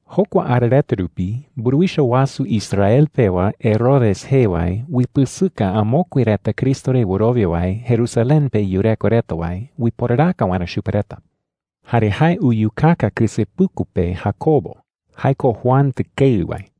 Jokua ara reta rupi mburuwicha wasu Israel pewa, Herodes jee wae, uipɨsɨka amokue reta Cristo re wɨrowia wae Jerusalén pe yureko reta wae uiporaraka waerä chupe reta. Jare jae uyukaka kɨsepuku pe Jacobo – jae ko Juan tɨkeɨ wae.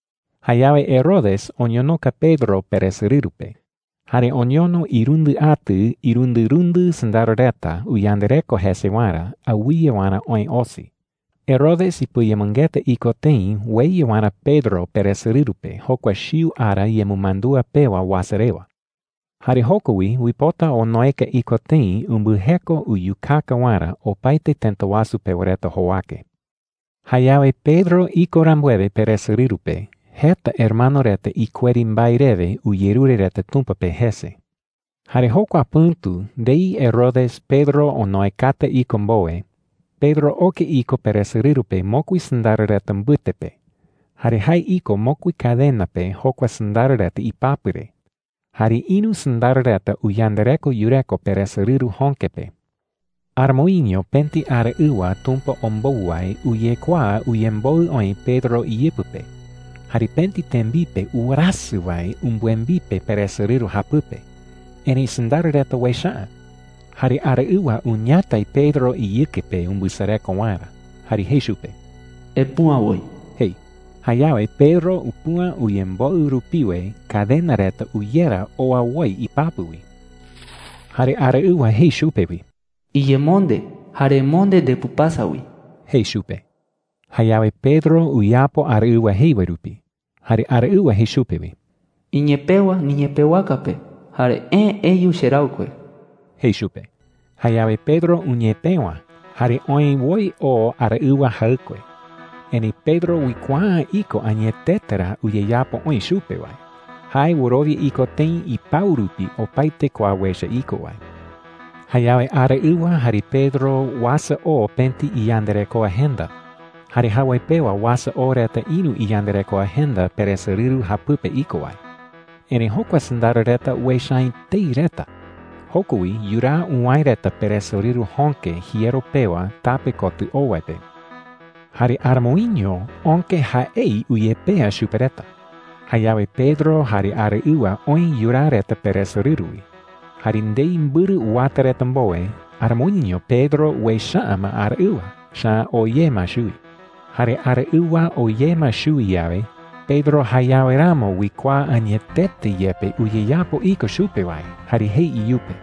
Jayawe Herodes oñonoka Pedro peresorɨru pe, jare oñono irundɨ atɨ irundɨrundɨ sɨndaro reta uyandareko jese waerä awɨye waerä oë osi. Herodes ipɨayemɨngeta iko tëi ueya waerä Pedro peresorɨru pe jokua chiu ara yemɨmandúa pewa uasa rewa. Jare joko wi uipota onoeka iko tëi umbɨjeko uyukaka waerä opaete tëta wasu pewa reta jowake. Jayawe Pedro iko rambuewe peresorɨru pe, jeta hermano reta ikueri mbae rewe uyerure reta Tumpa pe jese. Jare jokua pɨ̈tu ndei Herodes Pedro onoekata iko mbowe, Pedro oke iko peresorɨru pe mokui sɨndaro reta mbɨte pe. Jare jae iko mokui cadena pe jokua sɨndaro reta ipapɨ re. Jare ïru sɨndaro reta uyandareko yureko peresorɨru jöke pe. Aramoiño pëti araɨwa Tumpa ombou wae uyekuaa uyemboɨ oï Pedro iyɨpɨ pe. Jare pëti tembipe uwerasɨ wae umbɨembipe peresorɨru japɨpe. Erëi sɨndaro reta uecha’ä. Jare araɨwa uñatai Pedro iyɨke pe umbɨsareko waerä, jare jei chupe: “¡Epüa woi!” jei. Jayawe Pedro upüa uyemboɨ rupiwe, cadena reta uyera oa woi ipapɨ wi. Jare araɨwa jei chupe wi: “Iyemonde, jare emonde ndepɨpasa wi,” jei chupe. Jayawe Pedro uyapo araɨwa jei wae rupi. Jare araɨwa jei chupe wi: “Iñepëwa niñepëwaka pe jare eë eyu cheraɨkue,” jei chupe. Jayawe Pedro uñepëwa jare oë woi oo araɨwa jaɨkue. Erëi Pedro uikuaa’ä iko añetete ra uyeyapo oï chupe wae. Jae wɨrowia iko tëi ipau rupi opaete kua uecha iko wae. Jayawe araɨwa jare Pedro uasa oo pëti iyandarekoa jenda, jare jawoi pewa uasa oo reta ïru iyandarekoa jenda peresorɨru japɨpe iko wae. Erëi jokua sɨndaro reta uecha’ä etei reta. Joko wi yuraa uwäe reta peresorɨru jöke jiero pewa tape kotɨ oo wae pe. Jare aramoiño öke jaei uyepea chupe reta. Jayawe Pedro jare araɨwa oë yuraa reta peresorɨru wi. Jare ndei mbɨrɨ uwata reta mbowe, aramoiño Pedro uecha’ä ma araɨwa, echa’ä oo ye ma chuwi. Jare araɨwa oo ye ma chuwi yawe, Pedro jayawe ramo uikuaa añetete yepe uyeyapo iko chupe wae, jare jei iyupe: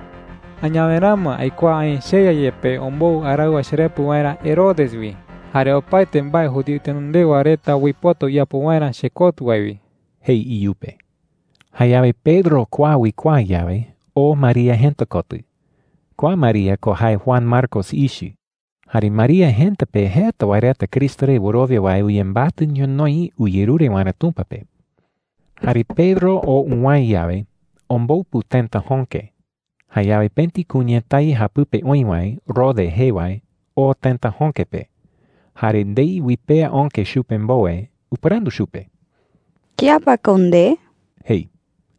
“Añawe ramo aikuaa aï cheYa yepe ombou araɨwa cherepɨ waerä Herodes wi jare opaete mbae judío itenondewa reta uipota uyapo waerä chekotɨ wae wi,” jei iyupe. Jayawe Pedro kua uikuaa yawe, oo María jëta kotɨ. Kua María ko jae Juan Marcos ichɨ. Jare María jëta pe jeta wae reta Cristo re wɨrowia wae uyembatɨ ñonoï uyerure waerä Tumpa pe. Jare Pedro oo uwäe yawe, ombopu tëta jöke. Jayawe pëti kuñatái japɨpe oï wae, Rode jee wae, oo tëta jöke pe. Jare ndei uipea öke chupe mbowe, upɨrandu chupe: “¿Kía pa ko nde?” jei.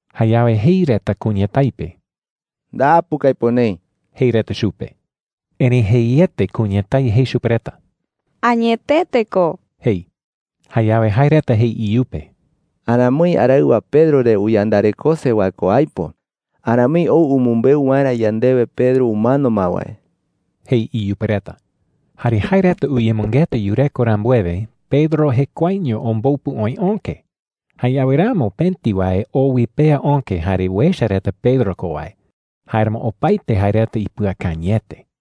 Jayawe jei reta kuñatái pe: “¡Ndapu ko aipo neï!” jei reta chupe. Erëi jeiete kuñatái jei chupe reta: “Añetete ko,” jei. Jayawe jae reta jei iyupe: “Aramoi araɨwa Pedro re uyandarekose wae ko aipo. Aramoi ou umɨmbeu waerä yandewe Pedro umano ma wae,” jei iyupe reta. Jare jae reta uyemɨngeta yureko rambuewe, Pedro jekuaeño ombopu oï öke. Jayawe ramo pëti wae oo uipea öke jare uecha reta Pedro ko wae. Jáeramo opaete jae reta ipɨakañɨete.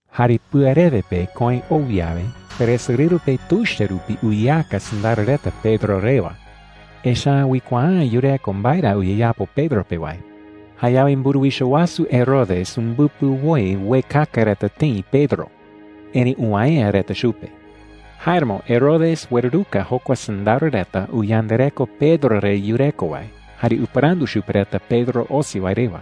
Jare pɨarewe pe köe ou yawe, peresorɨru pe tuicha rupi uyeaka sɨndaro reta Pedro rewa. Echa’ä uikuaa’ä yureko mbae ra uyeyapo Pedro pe wae. Jayawe mburuwicha wasu Herodes umbɨpɨ woi uekaka reta tëi Pedro, erëi uwäe’ä reta chupe. Jáeramo Herodes ueruruka jokua sɨndaro reta uyandareko Pedro re yureko wae, jare upɨrandu chupe reta Pedro osi wae rewa.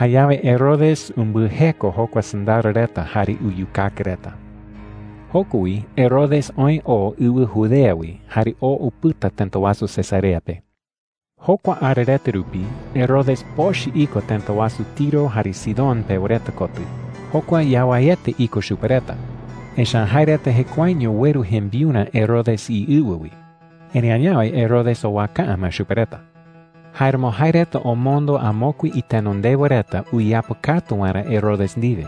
Jayawe Herodes umbɨjeko jokua sɨndaro reta jare uyukaka reta. Mburuwicha wasu Herodes umano wae rewa Joko wi Herodes oë oo ɨwɨ Judea wi jare oo upɨta tëta wasu Cesarea pe. Jokua ara reta rupi, Herodes pochɨ iko tëta wasu Tiro jare Sidón pewa reta kotɨ. Jokua yawaiete iko chupe reta, echa’ä jae reta jekuaeño ueru jembiurä Herodes iɨwɨ wi. Erëi añawe Herodes owaka’ä ma chupe reta. Jáeramo jae reta omondo amokue itenondewa reta uyeapɨkatu waerä Herodes ndiwe.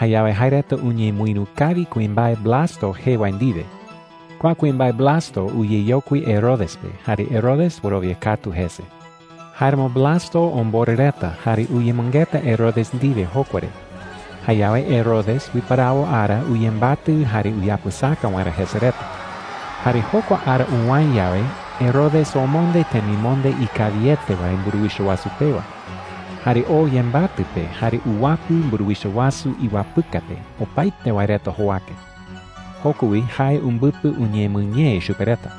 Jayawe jae reta uñemɨïru kawi kuimbae Blasto jee wae ndiwe. Kua kuimbae Blasto uyeyokui Herodes pe, jare Herodes wɨrowia katu jese. Jáeramo Blasto omborɨ reta jare uyemɨngeta Herodes ndiwe jokua re. Jayawe Herodes uiparawo ara uyembatɨ jare uyapɨsaka waerä jese reta. Jare jokua ara uwäe yawe, Herodes omonde temimonde ikawiete wae mburuwicha wasu pewa. Jare oo yembatɨ pe jare uwapɨ mburuwicha wasu iwapɨka pe opaete wae reta jowake. Joko wi jae umbɨpɨ uñemɨñee chupe reta.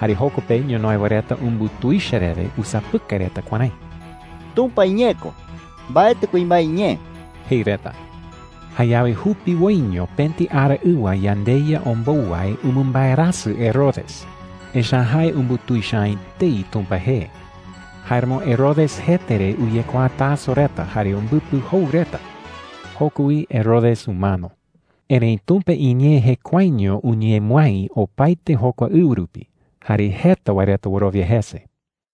Jare joko pe ñonoï wae reta umbutuicha rewe usapɨkai reta kuärái: “¡Tumpa iñee ko, mbaetɨ kuimbae iñee!” jei reta. Jayawe jupiwoiño pëti araɨwa yandeYa ombou wae umɨmbaerasɨ Herodes, echa’ä jae umbutuicha’ä etei Tumpa jee. Jáeramo Herodes jete re uyekuaa taso reta jare umbɨpɨ jou reta. Joko wi Herodes umano. Erëi Tumpa iñee jekuaeño uñemɨái opaete jokua ɨwɨ rupi, jare jeta wae reta wɨrowia jese.